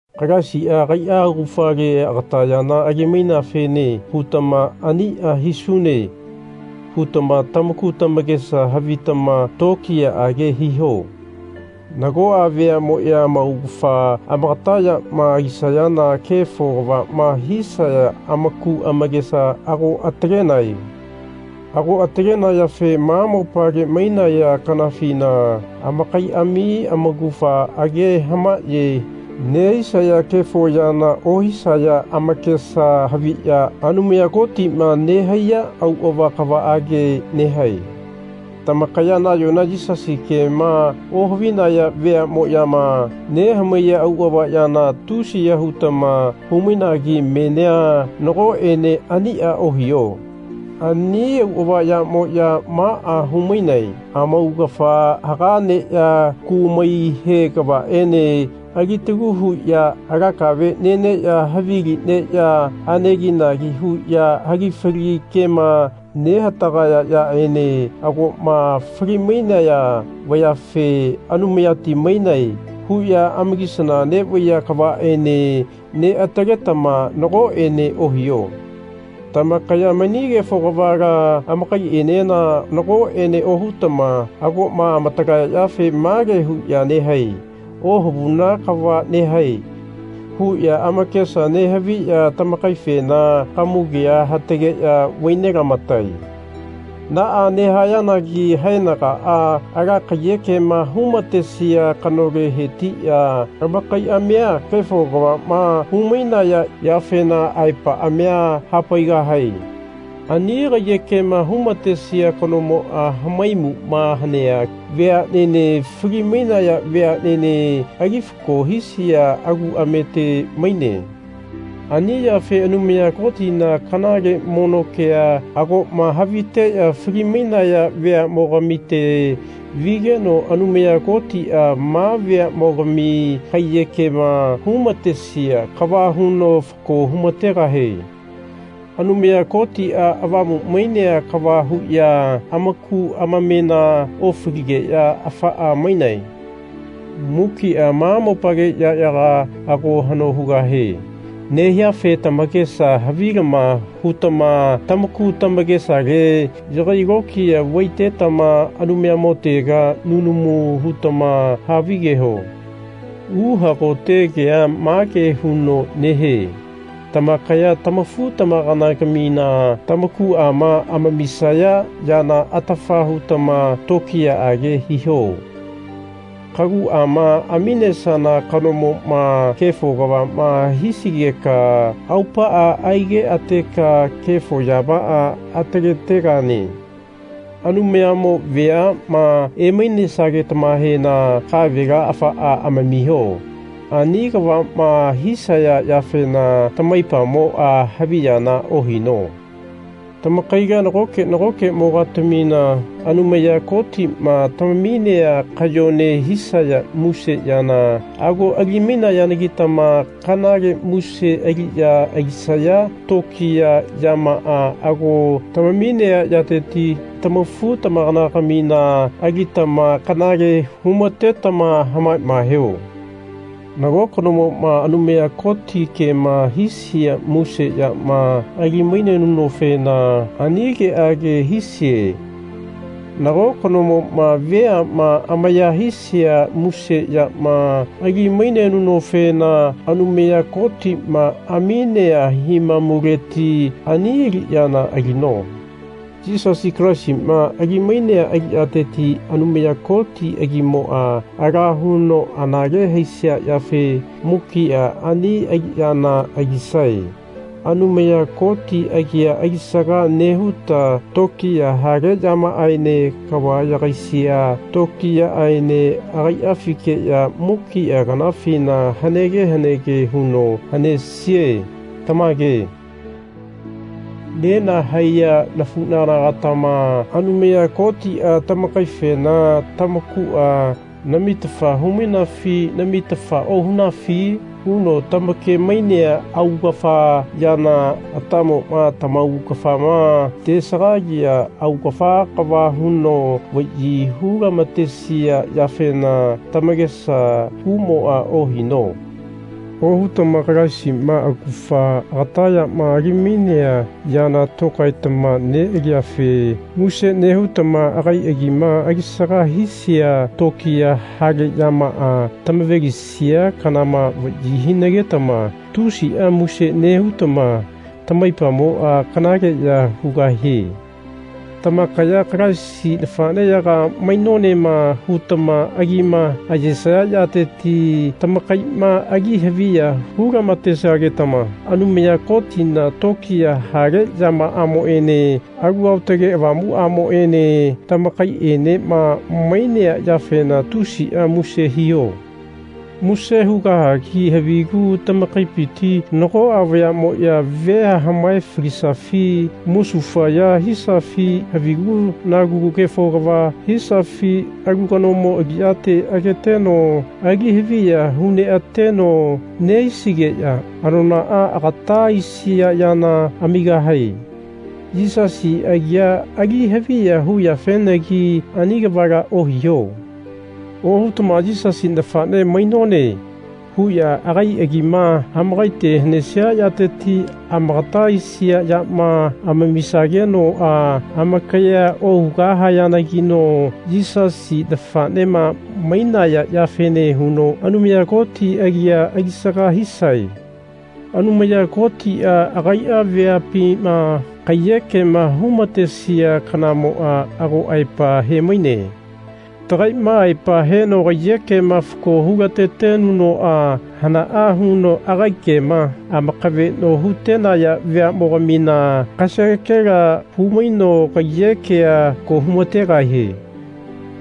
Kalaisia agaia augafale agata yana ali-maineafene hutama Ania hisune. hutama tamaku tamakesa havitama tokiyaage hiho. Nagoa veamoya amaugafa amagata yama alisayana kefo kavama hisaya amaku amakesa ago atalenae. Ago atalenayafe ma mopale mainaya kanafina amakaiami amaugafa age hamaye nehisaya kefo yana ohisaya amakesa haviya Anumaya Kotima nehaiya auava kavaage nehae. Tamakaya nayona Yisasi kema ohavinaya veamoyama nehamaiya auava yana tusiya hutama hu-mainagi menia nagoene ania ohiho. Ani auava yamoya maa hu-mainae, Amaugafa haga neya kumai he kavaene alitalu huya ala kave neneya havili neya aneginagi huya hagifali kema nehatagaya yaene agoma fali-mainaya vayafe Anumayati mainae. huya amakisana nevaiya kavaene neataletama nagoene ohiho. Tamakaya mani kefo kavala amakaienena nakoene ohutama agoma amatalaya yafe mage huya nehae Ohavuna kava nehae. huya amakesa nehaviya tamakaifena kamugea hatageya vai nelamatae. Naa nehayanagi haenagaa ala kaiyekema hu-matesia kanole hetiya amakaiamia kefo kavama hu-mainaya yafena aepaamia hapaigahae. Ani kaiyekema hu-matesia kanomoa hamaimuma hanea veanene fali-mainaya veanene ali fako hisia aguamete maine. Ani yafe Anumaya Kotina kanale mono kea agoma haviteya fali-mainaya veamogamite vigeno Anumaya Kotia ma veamogami kaiyekema hu-matesia kava huno fako hu-mategahie. Anumaya Kotia avamu mainea kava huya amaku amamena ofaligeya afaa mainae. Mukia ma mopale yayaga ago hano hugahe nehiafe tamakesa havilama hutama tamaku tamakesale yagai lokiya vaitetama Anumayamotega nunamu hutama havigeho. Uhagote kea mage huno nehie tamakaya tamafu-tamakana-gamina tamakuama amamisaya yana atafa hutama tokiyaage hiho. Kaguama aminesana kanomoma kefo kavama hisigeka aupaa aigeateka kefo yamaa ataletegane. Anumayamo veama emainesageta-mahena kavela afaa amamiho. Ani kavama hisaya yafena tamaipamoa haviyana ohino. Tamakaila nagoke nagokemo-gatamina Anumaya Kotima tamaminea kayone hisaya muse yana ago alimainayanagitama kanale muse aliya alisaya tokiya yamaa ago tamaminea yateti tama-futamakana-gamina alitama kanale hu-matetama hamamaeho. Nago kanomoma Anumaya Koti kema hisia muse yama ali-mainenunofena ani keage hisie. Nago kanomoma veama amaya hisia muse yama ali-mainenunofena Anumaya Kotima aminea himamuleti ani aliyana alino. Yisasi Kalaisima ali-mainea aliyateti Anumaya Koti agimoa ala huno anale haisia yafe mukia ani aliyana alisae. Anumaya Koti agia alisaga nehuta tokiya hale yamaaene kava yagaisia tokiyaaene agaiafikeya mukia kanafina hanege hanege huno hanesie. Tamage. Nenahaiya nafunagana-gatama Anumaya Kotia tamakaifena Tamakua namitafa hu-mainafi namitafa ohunafi? huno tamake-mainea augafa yana atamoma tamaugafama tesagalia augafa kava huno vayi hu-lamatesia yafena tamakesa kumoa ohino. Ohutama Kalaisima augafa agata yama ali-mainea yana tokaetama nealiyafe muse nehutama agai agima alisaga hisia tokiya hale yamaa tamave-lisia kanama vayi hinagetama tusia muse nehutama tamaipamoa kanaleya hugahie. Tamakaya Kalaisi nafaneyaga mainonema. hutama agima ayesaya yateti tamakaima ali haviya hu-lamatesagetama Anumaya Kotina tokiya hale yamaamoene Alu Aotage Avamuamoene tamakaienema mainea yafena tusia muse hiho. Muse hugahagi havigu tamakaipiti nagoa vayamoya vea hamae-falisafi musufaya hisafi havigu-nagu kefo kava hisafi alu kanomo aliyate ageteno ali haviya hu neateno nehisigeya anonaa agata aisia yana amigahae. Yisasi agia ali haviya huyafenagi ani kavala ohiho. Ohutama Yisasi nafane mainone. huya agai agima amakaite hanesia yateti amagata aisia yama amamisagenoa amakayea ohugahayanagino Yisasi nafanema mainaya yafene huno Anumaya Koti agia alisaga hisae. Anumaya Kotia agaia veapima kaiyekema hu-matesia kanamoa ago aepa he-maine. Tagaima aepa heno kaiyekema fako hu-latetenunoa hanaa huno agai kema amakaveno hutenaya veamogamina kasagekela hu-maino kaiyekea fako hu-mategahie.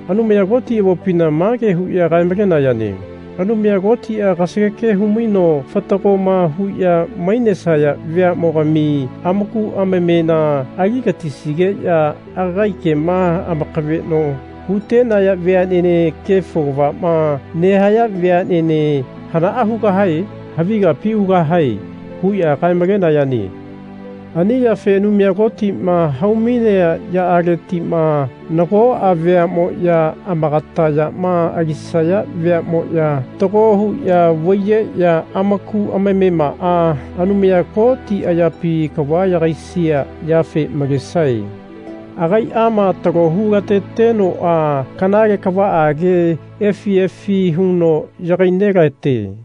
Anumaya Koti avopina mage huya kae-malenayane Anumaya Kotia kasageke humaino fatagoma huya mainesaya veamogami amaku amamena aligatisigeya agai kema amakaveno hutenaya veanene kefo kavama nehaya veanene hanaa hugahae? Havi kapi ugahae. huya kae-malenayane. Ani yafe Anumaya Kotima hau-mainea yamaaletima nagoa veamoya amakata yama alisaya veamoya fatago huya vaiyeya amaku amamemaa Anumaya Koti ayapi kava yagaisia yafe malesae. Agaiama talo hu-latetenoa kanale kavaage efi efi huno yagai nelate.